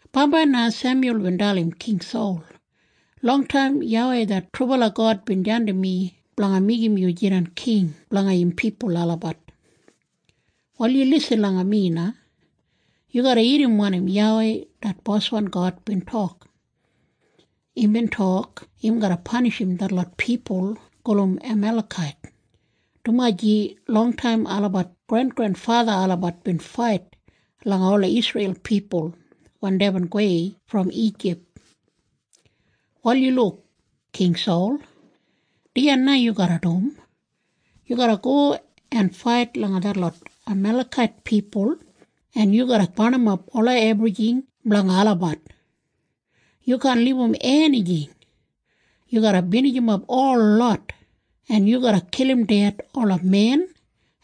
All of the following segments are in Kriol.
Bambai na Semyul bin dalim King Sol, “Longtaim YAWEI det trubala God bin jandim mi blanga meigim yu jidan king blanga im pipul olabat. “Wal yu lisin langa mi na. Yu garra irrim wanim YAWEI det boswan God bin tok. Imbin tok im garra panishim detlot pipul gulum Amalekait, dumaji longtaim olabat grengrenfatha olabat bin fait langa ola Isreil pipul wen deibin gowei brom Ijip. “Wal yu luk, King Sol. Dijan na yu garra dum. Yu garra go en fait langa detlot Amalekait pipul, en yu garra barnimap ola ebrijing blanga olabat. Yu kaan libum enijing. Yu garra binijimap holot, en yu garra kilim ded ola men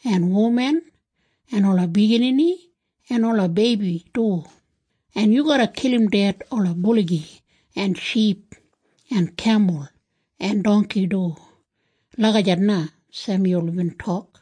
en wuman en ola biginini en ola beibi du, en yu garra kilim ded ola buligi en ship en kemul en dongki du.” Lagijat na Semyul bin tok.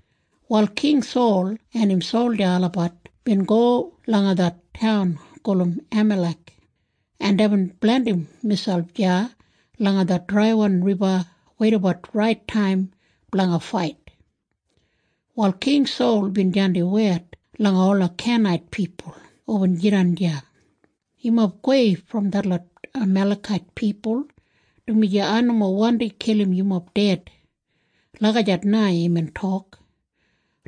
Wal King Sol en im solja olabat bin go langa det taun gulum Amalek, en deibin blandim miselp deya langa det draiwan riba weidabat rait taim blanga fait. Wal King Sol bin jandim wed langa ola Kenait pipul hubin jidan deya, “Yumob gowei brom detlot Amalekait pipul, dumaji ai nomo wandi kilim yumob ded.” Lagijat na imbin tok,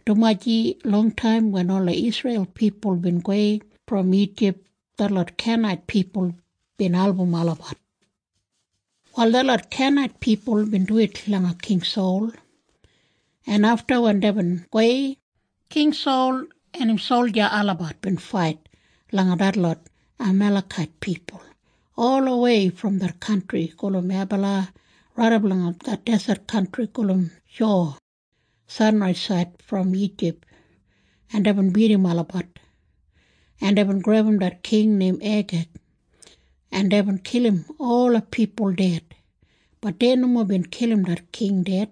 dumaji longtaim wen ola Isreil pipul bin gowei brom Ijip, detlot Kenait pipul bin album olabat. Wal detlot Kenait pipul bin duwit langa King Sol, en afta wen deibin gowei, King Sol en im solja olabat bin fait langa detlot Amalekait pipul olawei brom det kantri gulum Habila raidap langa det deset kantri gulum Shuwa sanraisaid brom Ijip, en deibin bidim olabat, en deibin grebum det king neim Eigeg, en deibin kilim ola pipul ded. Bat dei nomo bin kilim det king ded,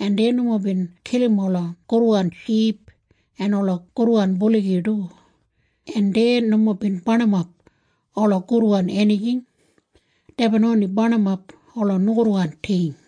en dei nomo bin kilim ola gudwan ship en ola gudwan buligi du, en dei nomo bin barnimap ola gudwan enijing. Deibin oni barnimap ola nogudwan ting.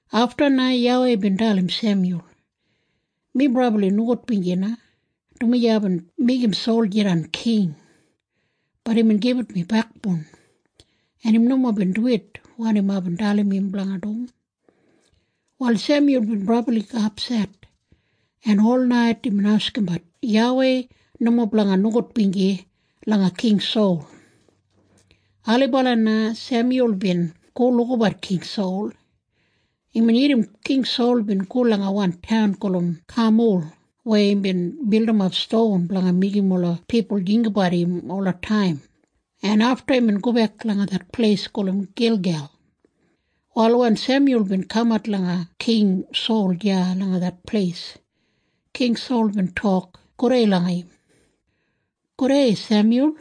Afta na YAWEI bin dalim Semyul, “Mi brabli nogudbinji na, dumaji aibin meigim Sol jidan king. Bat imbin gibit mi bekboun, en im nomo bin duwit wanim aibin dalim im blanga dum.” Wal Semyul bin brabli apset, en olnait imbin askimbat YAWEI nomo blanga nogudbinji langa King Sol. Ailibala na Semyul bin go lukabat King Sol. Imbin irrim King Sol bin go langa wan taun gulum Kamul weya imbin bildimap ston blanga meigim ola pipul jinggabat im olataim, en afta imbin gobek langa det pleis gulum Gilgel. Wal wen Semyul bin kamat langa King Sol deya langa det pleis, King Sol bin tok gudei langa im, “Gudei, Semyul.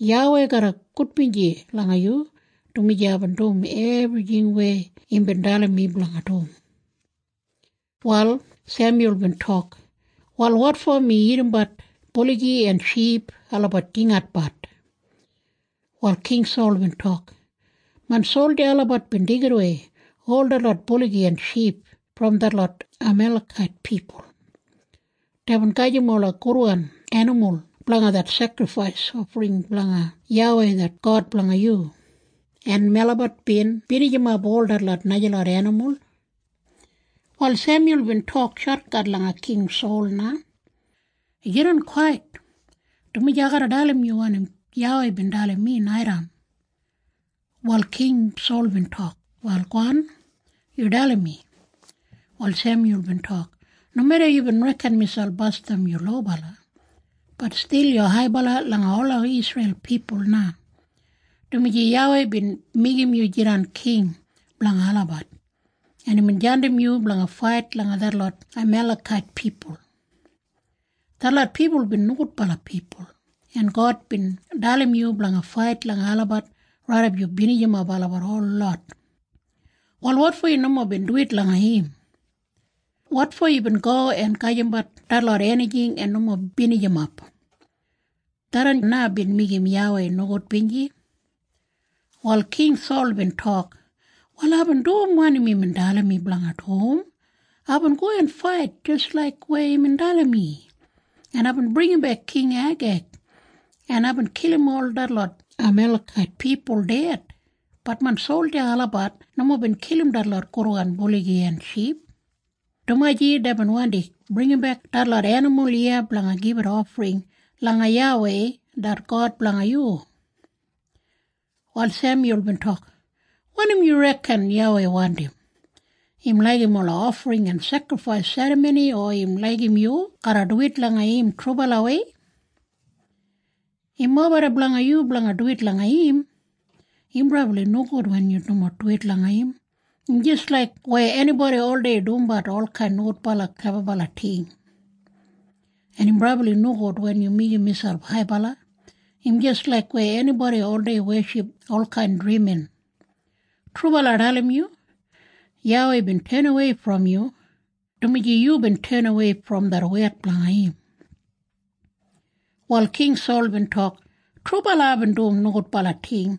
YAWEI garra gudbinji langa yu, dumaji aibin dum ebrijing weya imbin dalim mi blanga dum.” Wal Semyul bin tok, “Wal wotfo mi irrimbat buligi en ship olabat jingatbat?” Wal King Sol bin tok, “Main solja olabat bin deigidawei ol detlot buligi en ship brom detlot Amalekait pipul. Deibin gajim ola gudwan enimul blanga det sekrifais ofring blanga YAWEI det God blanga yu, en melabat bin binijimap ol detlot najalot enimul.” Wal Semyul bin tok shotkat langa King Sol na, “Yu jidan kwait, dumaji ai garra dalim yu wanim YAWEI bin dalim mi naitaim.” Wal King Sol bin tok, “Wal gowan. Yu dalim mi.” Wal Semyul bin tok, “Nomeda yubin reken miselp basdam yu lobala, bat stil yu haibala langa ola Isreil pipul na, dumaji YAWEI bin meigim yu jidan king blanga olabat, en imbin jandim yu blanga fait langa detlot Amalekait pipul. Detlot pipul bin nogudbala pipul, en God bin dalim yu blanga fait langa olabat raidap yu binijimap olabat holot. Wal wotfo yu nomo bin duwit langa im? Wotfo yubin go en gajimbat detlot enijing en nomo binijimap? Tharran na bin meigim YAWEI nogudbinji.” Wal King Sol bin tok, “Wal aibin dum wanim imbin dalim mi blanga dum. Aibin go en fait jis laik weya imbin dalim mi, en aibin bringimbek King Eigeg, en aibin kilim ol detlot Amalekait pipul ded. Bat main solja olabat nomo bin kilim detlot gudwan buligi en ship, dumaji deibin wandi bringimbek detlot enimul iya blanga gibit ofring langa YAWEI det God blanga yu.” Wal Semyul bin tok, “Wanim yu reken YAWEI wandim? Im laigim ola ofring en sekrifais serramoni o im laigim yu garra duwit langa im trubalawei? Im mobeda blanga yu blanga duwit langa im. Im brabli nogud wen yu nomo duwit langa im. Im jis laik weya enibodi oldei dumbat olkain nogudbala klebabala ting. En im brabli nogud wen yu meigim miselp haibala. Im jis laik weya enibodi oldei weship olkain drimin. Trubala ai dalim yu. YAWEI bin tenawei brom yu, dumaji yubin tenawei brom det wed blanga im.” Wal King Sol bin tok, “Trubala aibin dum nogudbala ting.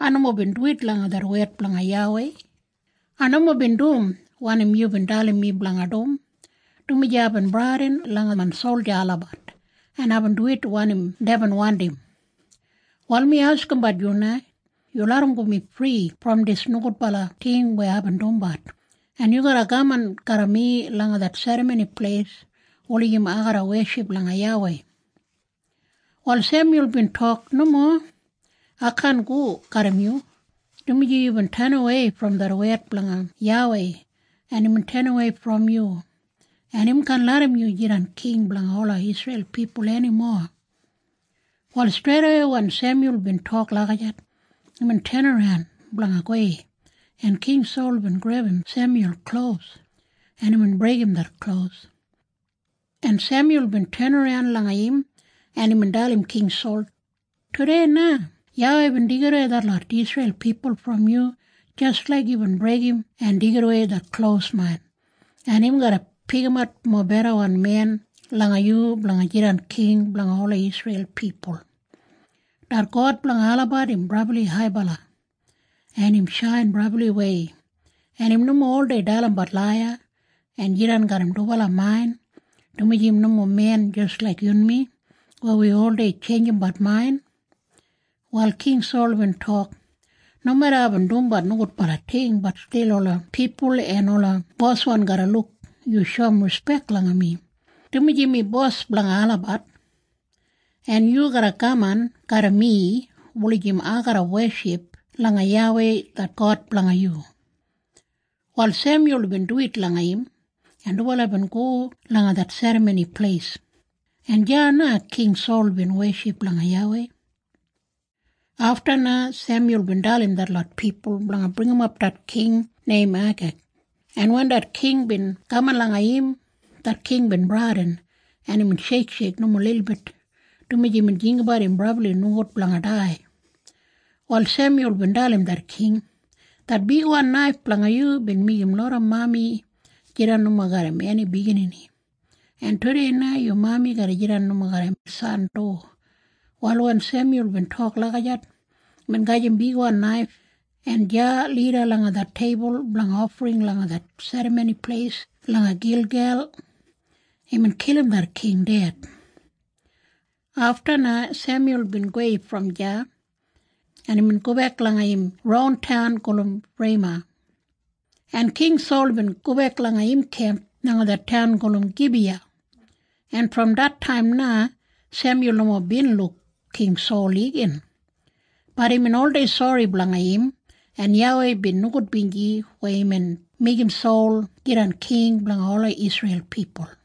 Ai nomo bin duwit langa det wed blanga YAWEI. Ai nomo bin dum wanim yubin dalim mi blanga dum, dumaji aibin bradin langa main solja olabat, en aibin duwit wanim deibin wandim. “Wal mi askimbat yu na. Yu larramgo mi fri brom dis nogudbala ting weya aibin dumbat, en yu garra kaman garra mi langa det serramoni pleis wulijim ai garra weship langa YAWEI.” Wal Semyul bin tok, “Nomo. Ai kaan go garram yu, dumaji yubin tenawei brom det wed blanga YAWEI, en imbin tenawei brom yu, en im kaan larram yu jidan king blanga ola Isreil pipul enimo.” Wal streidawei wen Semyul bin tok lagijat, imbin tenaran blanga gowei, en King Sol bin grebum Semyul klos, en imbin breigim det klos, en Semyul bin tenaran langa im, en imbin dalim King Sol, “Tudei na YAWEI bin deigidawei detlot Isreil pipul brom yu jis laik yubin breigim en deigidawei det klos main, en im garra pikimat mobedawan men langa yu blanga jidan king blanga ola Isreil pipul. Det God blanga olabat im brabli haibala, en im shain brabliwei, en im nomo oldei dalimbat laiya en jidan garram dubala main, dumaji im nomo men jis laik yunmi weya wi oldei tjeinjimbat main.” Wal King Sol bin tok, “Nomeda aibin dumbat nogudbala ting, bat stil ola pipul en ola boswan garra luk yu shoum rispek langa mi, dumaji mi bos blanga olabat, en yu garra kaman garram mi wulijim ai garra weship langa YAWEI det God blanga yu.” Wal Semyul bin duwit langa im, en dubala bin go langa det serramoni pleis, en deya na King Sol bin weship langa YAWEI. Afta na Semyul bin dalim detlot pipul blanga bringimap det king neim Eigeg, en wen det king bin kaman langa im, det king bin bradin, en imbin sheiksheik nomo lilbit, dumaji imbin jinggabat im brabli nogud blanga dai. Wal Semyul bin dalim det king, “Det bigwan naif blanga yu bin meigim loda mami jidan nomo garram eni biginini. En tudei na yu mami garra jidan nomo garram san du.” Wal wen Semyul bin tok lagijat, imbin gajim bigwan naif, en deya lida langa det teibul blanga ofring langa det serramoni pleis langa Gilgel, imbin kilim det king ded. Afta na Semyul bin gowei brom deya, en imbin gobek langa im ron taun gulum Rema, en King Sol bin gobek langa im kemp langa det taun gulum Gibiya, en brom det taim na Semyul nomo bin luk King Sol igin. Bat imbin oldei sori blanga im, en YAWEI bin nogudbinji weya imbin meigim Sol jidan king blanga ola Isreil pipul.